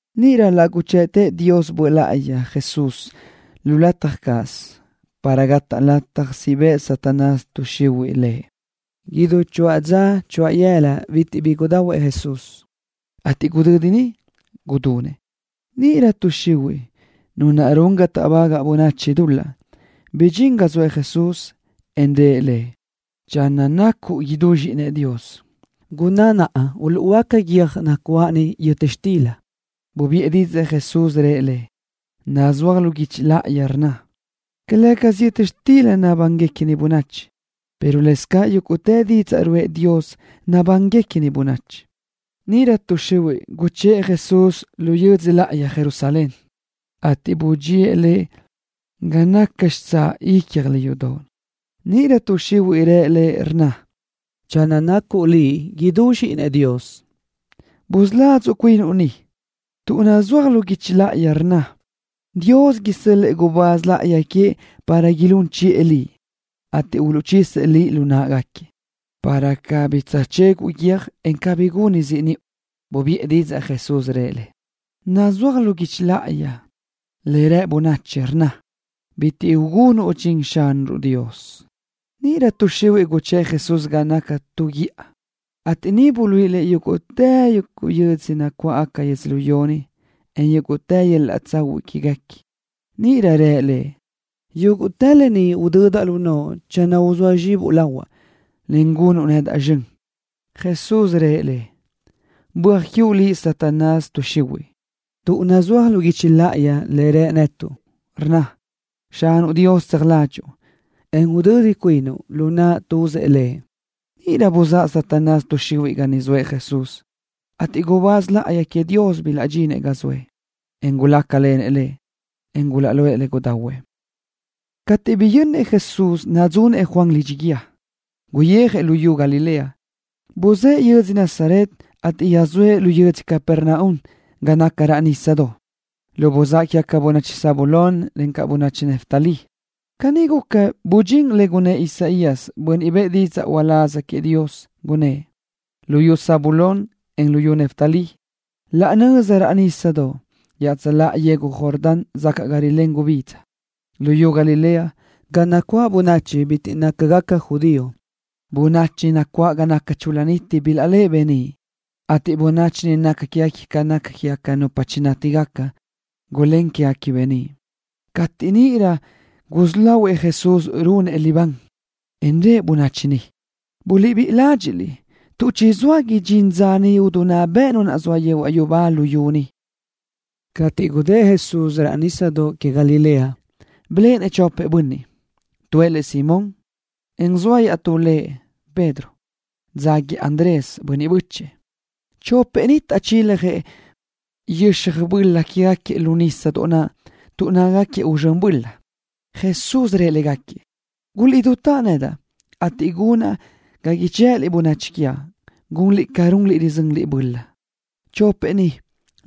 Níʼirö laʼ guchëʼtëʼ Dios Böʼ Láʼayi Jesús lu lataj cáʼasö para gataʼ lataj siʼ bëʼ Satanás tuʼ xihuiʼ Lëʼ. Idú choáʼ dza choáʼ yëla bitiʼ bi gudahuëʼ Jesús, ateʼ gudödi niʼ ridunëʼ. Níʼirö tuʼ xihuiʼ, nu naʼ run ga táʼbagaʼ bönachi dul-laʼ, bidxín ga zoëʼ Jesús, en rë Lëʼ: —Channö nacuʼ idú Zxíʼinëʼ Dios, gunná naʼa uluʼhuöáca guiö́j nacuáʼ ni yöta xtila. Bubiʼë didzaʼ Jesús, rëʼ le: —Nazúaj lu guichi láʼayi le rnna: “Calë́gasö yöta xtila nabánigaca bönachi, pero lëscaʼ yúguʼtë didzaʼ ruʼë Dios nabánigaca bönachi.” Níʼirö tuʼ xihuiʼ guchë́ʼ Jesús lu yödzö láʼayi Jerusalén, ateʼ budxía Lëʼ ga naca xitsáʼ ícjoʼolö yudoʼ. Níʼirö tuʼ xihuiʼ rë Lëʼ, rnna: —Channö nacuʼ Liʼ idú Zxíʼinëʼ Dios, busuladzuʼ cuinuʼ ni, tuʼ nazúaj lu guichi láʼayi le rnna: Dios isö́l-lëʼë gubáz láʼayi queëʼ para ilún chiʼë Liʼ, ateʼ uluʼchisëʼ Liʼ lu náʼagaquiëʼ, para cabí tsöjchéguʼu guiö́j, en cabí gunuʼ ziʼ niʼu. Bubiʼë didzaʼ Jesús, rëʼ le: —Iaʼstú nazúaj lu guichi láʼayi, le rë bönachi, rnna: “Bitiʼ ugunuʼ dxin Xanuʼ Dios.” Níʼirö tuʼ xihuiʼ guchë́ʼ Jesús ga naca tu lu guíʼa sibi, ateʼ niʼ buluíʼi Lëʼ yúguʼtë yödzö nacuáʼ yödzölió ni, en yúguʼtë yöl-laʼ tsahuiʼ quéguequi. Níʼirö rë Lëʼ: —Yúguʼtë lë ni udödaʼ lu noʼo channö uzóa zxibuʼ lahuaʼ, en gunuʼ nedaʼ zxön. Jesús rëʼ le: —Böaj quiuʼ liʼ, Satanás tuʼ xihuiʼ, tuʼ nazúaj lu guichi láʼayi le rë netuʼ, rnna: “Xanuʼ Dios tseaj ládxuʼu, en udödi cuinuʼ lu naʼ tuzëʼ Lëʼ.” Níʼirö buzáʼ Satanás tuʼ xihuiʼ ga naʼ zoëʼ Jesús, ateʼ gubáz láʼayi queëʼ Dios bilaʼdxinëʼ ga zoëʼ, en gulácalenëʼ Lëʼ, en gulaʼguʼë le gudahuëʼ. Cateʼ biyönnëʼ Jesús nadzunëʼ Juan lidxi guíë, guyijëʼ luyú Galilea. Buzë́ʼë yödzö Nazaret, ateʼ yöjsóëʼ lu yödzö Capernaum ga naca raʼ nísadoʼ, lu buzáʼ quégaca bönachi Zabulón, en bönachi Neftalí. Caní guca, bidxín lë naʼ gunnë́ʼ Isaías, bönniʼ bëʼë didzaʼ uláz queëʼ Dios, gunnë́ʼ: Luyú Zabulón, en luyú Neftalí, laʼ nöza raʼ nísadoʼ iaʼtsöláʼa yegu Jordán sacaʼ ga rilén gubidza. Luyú Galilea, ga nacuáʼ bönachi bitiʼ nácagaca judío. Bönachi chul-la niti niʼ bilaʼléʼe beníʼ, ateʼ bönniʼ niʼ nácagaquiëʼ ca nupa chinátigaca, gulén quégaquiëʼ beníʼ. Cateʼ níʼirö gusí lahuëʼ Jesús runëʼ libán, en rëʼ bönachi niʼ: —Buliʼbíʼi ládxiʼliʼ, tuʼ chizóa idxín dza idinná bëʼ Nu naʼ zoa yehuaʼ yubá luyú ni. Cateʼ gudë́ʼ Jesús raʼ nísadoʼ que Galilea, biléʼenëʼ chopëʼ bönniʼ. Tuëʼ lëʼ Simón, en zoa iaʼtú lëʼ Pedro, ateʼ dzáguiëʼ Andrés, bönniʼ bö́chëʼë, lëʼ. Chopëʼ ni taʼchiljëʼ yöxaj böla quégaquiëʼ lu nísadoʼ naʼ tuʼ nácagaquiëʼ uzxö́n böla. Jesús rëʼ légaquiëʼ: —Guliʼdutáʼ nedaʼ, ateʼ gunaʼ ga ichë́ʼëliʼ bönachi quiaʼ, gunliʼ ca runliʼ rizönliʼ-baʼ böla. Chopëʼ ni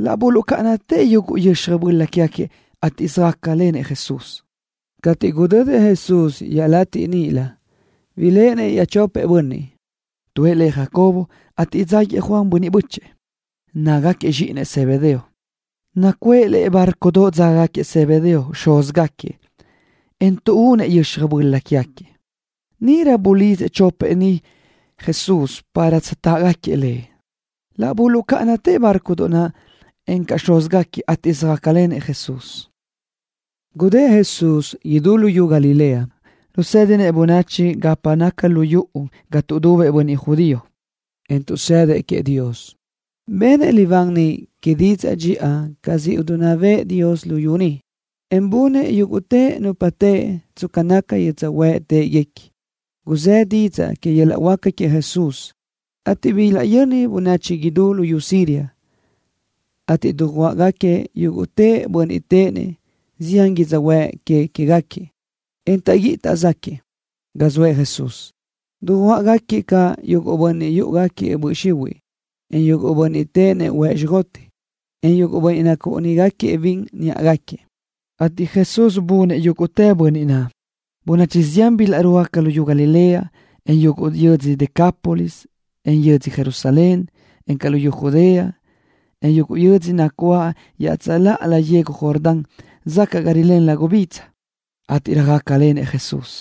laʼ buluʼcáʼanatëʼ yuguʼ yöxaj böla quégaquiëʼ, ateʼ söjácalenëʼ Jesús. Cateʼ gudödëʼ Jesús iaʼlatiʼ níʼilö, biléʼenëʼ iaʼchopëʼ bönniʼ. Tuëʼ lëʼ Jacobo, ateʼ dzáguiëʼ Juan, bönniʼ bö́chëʼë lëʼ. Nácagaquiëʼ zxíʼinëʼ Zebedeo. Nacuʼë lëʼe bárcodoʼ dzágagaquiëʼ Zebedeo, xúzgaquiëʼ, en tuʼúnëʼ yöxaj böla quégaquiëʼ. Níʼirö Jesús bulidzëʼ chopëʼ ni para tsöjtáʼgaquiëʼ Lëʼ. Laʼ buluʼcáʼanatëʼ bárcodoʼ naʼ, encaʼ xúzgaquiëʼ, ateʼ söjácalenëʼ Jesús. Gudë́ʼ Jesús idú luyú Galilea, rusédinëʼ bönachi gapa naca lu yuʼu ga tuʼdubëʼ bönniʼ judío, en tuʼsëdëʼ queëʼ Dios. Benëʼ libán niʼ que didzaʼ dxiʼa ca siʼ idinná bëʼë Dios luyú niʼ, en bunëʼ yúguʼtë nupa teʼe tsca naca yödzöhuë́ʼ téʼeguequi. Guzë́ didzaʼ que yöl-laʼ huáca queëʼ Jesús, ateʼ bilaʼyöni bönachi idú luyú Siria, ateʼ dujuáʼgaquiëʼ yúguʼtë bönniʼ téʼenëʼ zián yödzöhuë́ʼ que queë́gaquiëʼ, en taʼguíʼi taʼzaquiëʼ, ga zoëʼ Jesús. Dujuáʼgaquiëʼ caʼ yuguʼ bönniʼ yúʼugaquiëʼ böʼ xihuiʼ, en yuguʼ bönniʼ téʼenëʼ huëʼ xjoteʼ, en yuguʼ bönniʼ nacúʼunigaquiëʼ bin niʼa náʼagaquiëʼ, ateʼ Jesús bunëʼ yúguʼtë bönniʼ naʼ. Bönachi zián bilaʼrúajgaca luyú Galilea, en yuguʼ yödzö Decápolis, en yödzö Jerusalén, encaʼ luyú Judea, en yuguʼ yödzö nacuáʼ iaʼtsöláʼalö yegu Jordán sacaʼ ga rilén gubidza, ateʼ röjácalen Jesús.